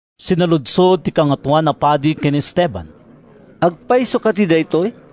Sinaludsod ti Kangatoan a Padi ken ni Esteban, “Agpayso kadi daytoy?”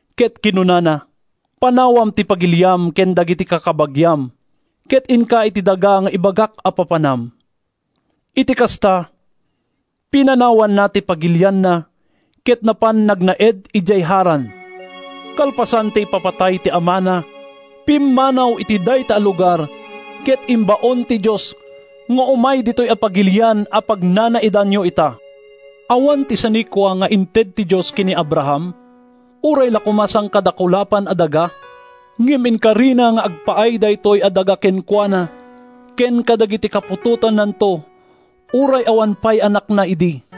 ket kinunana, ‘Panawam ti pagiliam ken dagiti kakabagiam ket inka iti daga nga ibagak a papanam.’ “Iti kasta, pinanawanna ti pagilianna ket napan nagnaed idiay Haran. Kalpasan ti ipapatay ti amana, pimmanaw iti dayta a lugar ket imbaon ti Dios nga umay ditoy a pagilian a pagnanaedanyo ita. Awan ti sanikua nga inted ti Dios ken ni Abraham, uray la koma sangkadakulapan a daga, ngem inkarina nga agpaay daytoy a daga kenkuana ken kadagiti kaputotannanto uray awan pay anakna idi.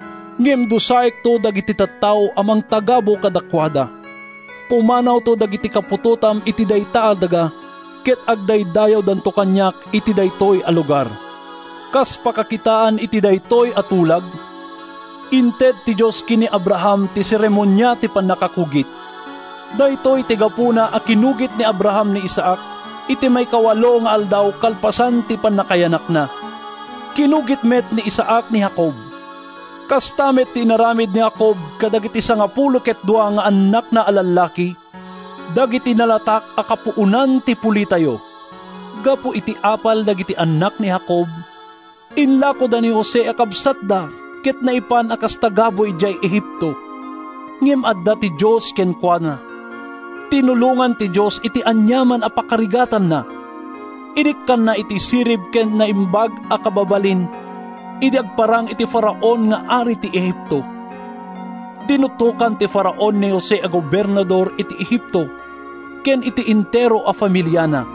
Ngem dusaekto dagiti tattao a mangtagabu kadakuada. Pumanawto dagiti kaputotam iti dayta a daga ket agdaydayawdanto kaniak iti daytoy a lugar.’ “Kas pakakitaan iti daytoy a tulag, inted ti Dios ken ni Abraham ti seremonia ti pannakakugit. Daytoy ti gapuna a kinugit ni Abraham ni Isaac iti maikawalo nga aldaw kalpasan ti pannakayanakna. Kinugit met ni Isaac ni Jacob. Kasta met ti inaramid ni Jacob kadagiti sangapulo ket dua nga annakna a lallaki, dagiti nalatak a kapuonan ti pulitayo. “Gapu iti apal dagiti annak ni Jacob, inlakoda ni Jose a kabsatda ket naipan a kas tagabu idiay Egipto. Ngem adda ti Dios kenkuana. Tinulongan ti Dios iti aniaman a pakarigatanna. Inikkanna iti sirib ken naimbag a kababalin idi agparang iti Faraon nga ari ti Egipto. Dinutokan ti Faraon ni Jose a gobernador iti Egipto ken iti entero a familiana.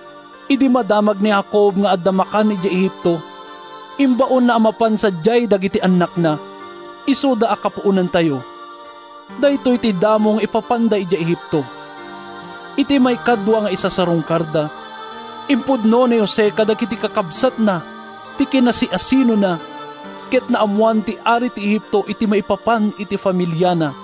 Idi madamag ni Jacob nga adda makan idiay Egipto, imbaonna a mapan sadiay dagiti annakna, isuda a kapuonantayo. Daytoy ti damo nga ipapanda idiay Egipto. Iti maikadua nga isasarungkarda, impudno ni Jose kadagiti kakabsatna ti kinasiasinona ket naammoan ti ari ti Egipto ti maipapan iti familiana.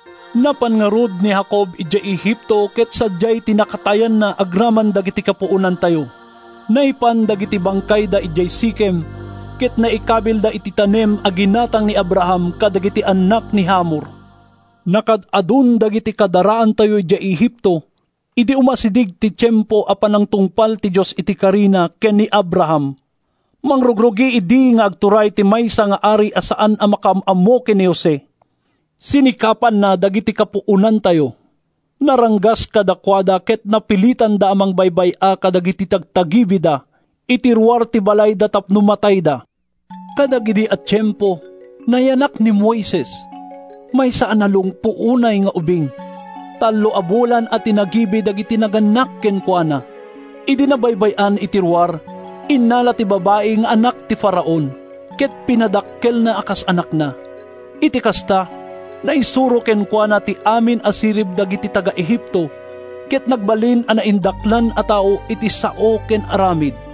“Napan ngarud ni Jacob idiay Egipto ket sadiay ti nakatayanna agraman dagiti kapuonantayo. Naipan dagiti bangkayda idiay Sikem, ket naikabilda iti tanem a ginatang ni Abraham kadagiti annak ni Hamor. “Nakaad-adun dagiti kadaraantayo idiay Egipto idi umasideg ti tiempo a panangtungpal ti Dios iti karina ken ni Abraham. Mangrugrugi idi nga agturay ti maysa nga ari a saan a makaam-ammo ken ni Jose. Sinikapanna dagiti kapuonantayo. Naranggas kadakuada ket napilitanda a mangbaybay-a kadagiti tagtagibida iti ruar ti balayda tapno matayda. “Kadagidi a tiempo, nayanak ni Moises, maysa a nalungpo unay nga ubing. Tallo a bulan a tinagibi dagiti nagannak kenkuana. Idi nabaybay-an iti ruar, innala ti babai nga anak ti Faraon, ket pinadakkelna a kas anakna. Iti kasta, naisuro kenkuana ti amin a sirib dagiti taga-Egipto ket nagbalin a naindaklan a tao iti sao ken aramid.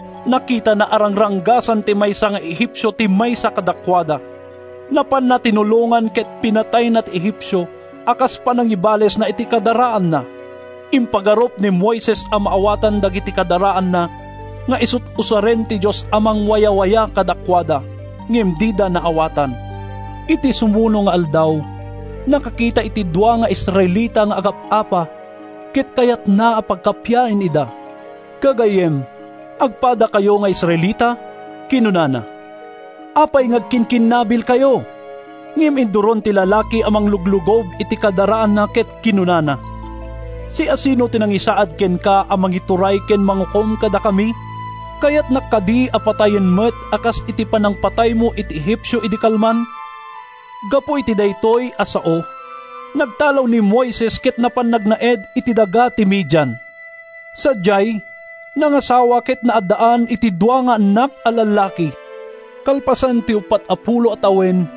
Nakitana a rangranggasan ti maysa nga Egipcio ti maysa kadakuada. Napanna tinulongan ket pinatayna ti Egipcio a kas panangibalesna iti kadaraanna. ( Impagarup ni Moises a maawatan dagiti kadaraanna nga isut’ usaren ti Dios a mangwayawaya kadakuada. Ngem dida naawatan.) “Iti sumuno nga aldaw, nakakita iti dua nga Israelita nga agap-apa ket kayatna a pagkappiaen ida. ‘Gagayyem, agpadakayo nga Israelita?’ kinunana. ‘Apay nga agkinkinnabilkayo?’ “Ngem induron ti lalaki a mangluglugob iti kadaraanna ket kinunana, ‘Siasino ti nangisaad kenka a mangituray ken mangukom kadakami? Kayatnak kadi a patayen met a kas iti panangpataymo iti Egipcio idi kalman?’ “Gapu iti daytoy a sao, nagtalaw ni Moises ket napan nagnaed iti daga ti Midian. Sadiay, nangasawa ket naaddaan iti dua nga annak a lallaki. “Kalpasan ti uppat a pulo a tawen,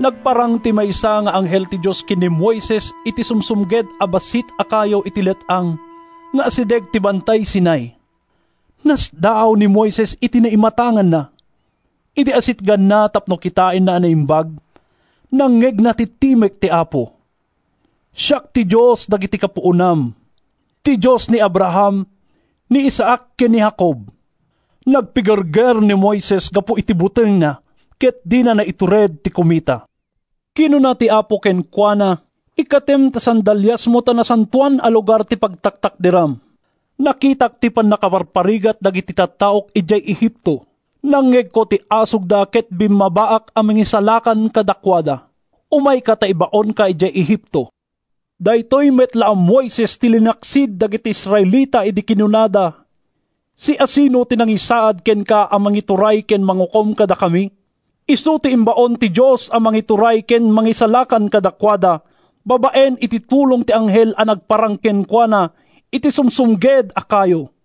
nagparang ti maysa nga anghel ti Dios ken ni Moises iti sumsumged a bassit a kayo iti let-ang nga asideg ti Bantay Sinai. Nasdaaw ni Moises iti naimatanganna. Idi asitganna tapno kitaenna a naimbag, nangngegna ti timek ti Apo: ‘Siak ti Dios dagiti kapuonam, ti Dios ni Abraham, ni Isaac ken ni Jacob.’ “Nagpigerger ni Moises gapu iti butengna ket dina naitured ti kumita. Kinuna ti Apo kenkuana, ‘Ikkatem ta sandaliasmo ta nasantoan a lugar ti pagtaktakderam. Nakitak ti pannakaparparigat dagiti tattaok idiay Egipto. Nangngegko ti asugda ket bimmabaak a mangisalakan kadakuada. Umayka ta ibaonka idiay Egipto.’ “Daytoy met la a Moises ti linaksid dagiti Israelita idi kinunada, ‘Siasino ti nangisaad kenka a mangituray ken mangukom kadakami?’ Isu ti imbaon ti Dios a mangituray ken mangisalakan kadakuada babaen iti tulong ti anghel a nagparang kenkuana iti sumsumged a kayo.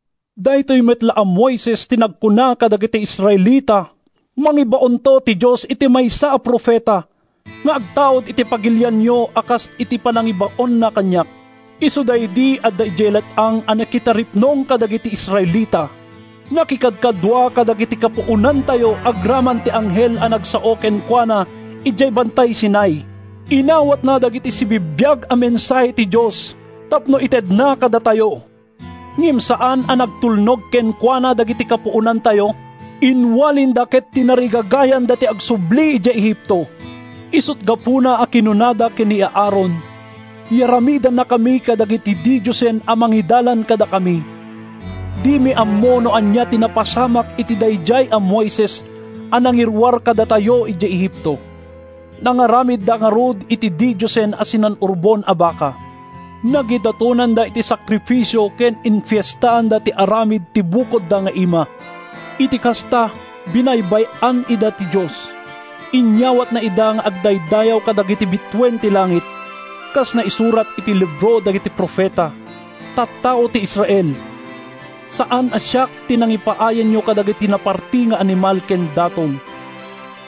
Daytoy met la a Moises ti nagkuna kadagiti Israelita, ‘Mangibaonto ti Dios iti maysa a profeta nga agtaud iti pagilianyo a kas iti panangibaonna kaniak.’ Isu daydi adda idiay let-ang a nakitaripnong kadagiti Israelita. Nakikadkadua kadagiti kapuonantayo agraman ti anghel a nagsao kenkuana idiay Bantay Sinai. Inawatna dagiti sibibiag a mensahe ti Dios tapno itedna kadatayo. “Ngem saan a nagtulnog kenkuana dagiti kapuonantayo. Inwalinda ket tinarigagayanda ti agsubli idiay Egipto. Isut’ gapuna a kinunada ken ni Aaron: ‘Yaramidannakami kadagiti didiosen a mangidalan kadakami. Dimi ammo no ania ti napasamak iti daydiay a Moises a nangiruar kadatayo idiay Egipto.’ “Nangaramidda ngarud iti didiosen a sinan-urbon a baka. Nagidatonanda iti sakrifisio ken infiestaanda ti aramid ti bukodda nga ima. “Iti kasta, binaybay-an ida ti Dios. Inyawatna ida nga agdaydayaw kadagiti bituen ti langit, kas naisurat iti libro dagiti profeta: ‘Tattao ti Israel! Saan a siak ti nangipaayanyo kadagiti naparti nga animal ken daton,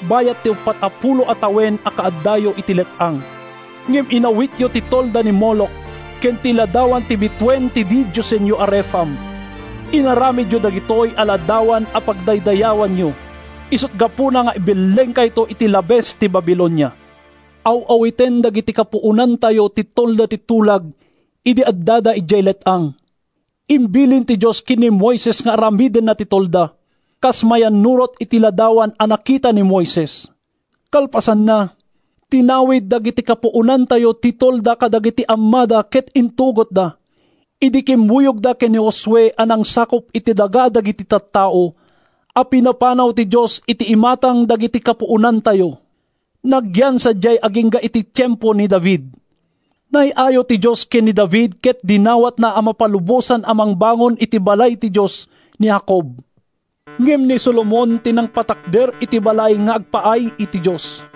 bayat ti uppat a pulo a tawen a kaaddayo iti let-ang. Ngem inawityo ti tolda ni Moloch, ken ti ladawan ti bituen ti didiosenyo a Refam. Inaramidyo dagitoy a ladawan a pagdaydayawanyo. Isut’ gapuna nga ibellengkayto iti labes ti Babilonia.’ “Aw-awiten dagidi kapuonantayo ti Tolda ti Tulag idi addada idiay let-ang. Imbilin ti Dios ken ni Moises nga aramidenna ti tolda, kas mayannurot iti ladawan a nakita ni Moises. Kalpasanna, tinawid dagiti kapuonantayo ti tolda kadagiti ammada ket intugotda idi kimmuyogda ken ni Josue a nangsakup iti daga dagiti tattao a pinapanaw ti Dios iti imatang dagiti kapuonantayo. Nagyan sadiay agingga iti tiempo ni David. Naay-ayo ti Dios ken ni David ket dinawatna a mapalubosan a mangbangon iti balay ti Dios ni Jacob. Ngem ni Solomon ti nangpatakder iti balay nga agpaay iti Dios.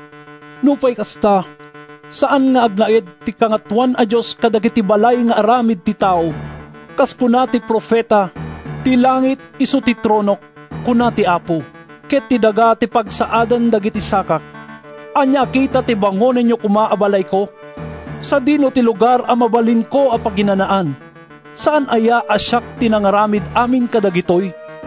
“Nupay kasta, saan nga agnaed ti Kangatoan a Dios kadagiti balay nga aramid ti tao. Kas kuna ti profeta: ‘Ti langit isu ti tronok, kuna ti Apo, Ket ti daga ti pagsaadan dagiti sakak. Ania a kita ti bangonenyo koma a balayko? Sadino ti lugar a mabalinko a paginanaan? Saan aya a siak ti nangaramid amin kadagitoy?’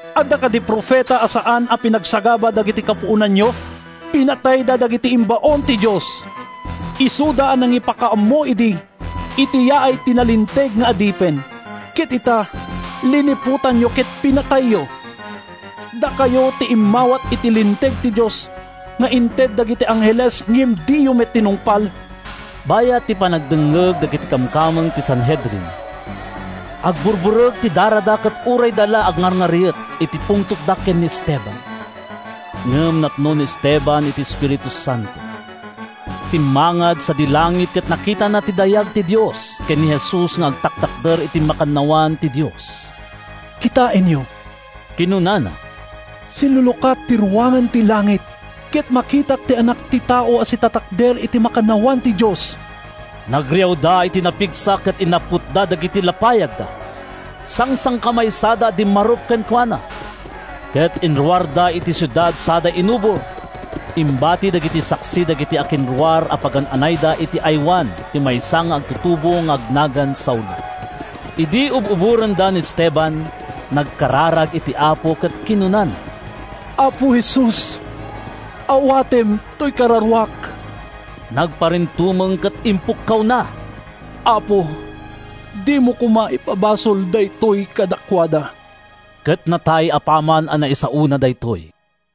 Adda kadi profeta a saan a pinagsagaba dagidi kapuonanyo? Pinatayda dagiti imbaon ti Dios, isuda a nangipakaammo idi iti yaay ti Nalinteg nga Adipen. Ket ita, liniputan ken pinatayyo. Dakayo ti immawat iti linteg ti Dios nga inted dagiti angheles ngem diyo met tinungpal!” Bayat ti panagdengngeg dagiti kamkameng ti Sanhedrin, agburburek ti darada ket urayda la agngarngariet iti pungtotda ken ni Esteban. Ngem napno ni Esteban iti Espiritu Santo. Timmangad sadi langit ket nakitana ti dayag ti Dios ken ni Jesus nga agtaktakder iti makannawan ti Dios. “Kitaenyo!” kinunana, “silulukat ti ruangan ti langit ket makitak ti Anak ti Tao a sitatakder iti makannawan ti Dios!” Nagriawda iti napigsa ket inapputda dagiti lapayagda. Sangsangkamaysada a dimmarup kenkuana, ket inruarda iti siudad sada inubor. Imbati dagiti saksi dagiti akinruar a pagan-anayda iti aywan ti maysa nga agtutubo nga agnagan Saulo. Idi ub-uborenda ni Esteban, nagkararag iti Apo ket kinunana, “Apo Jesus, awatem toy kararuak!” Nagparintumeng ket impukkawna, “Apo, dimo koma ipabasol daytoy kadakuada.” Ket natay apaman a naisaona daytoy.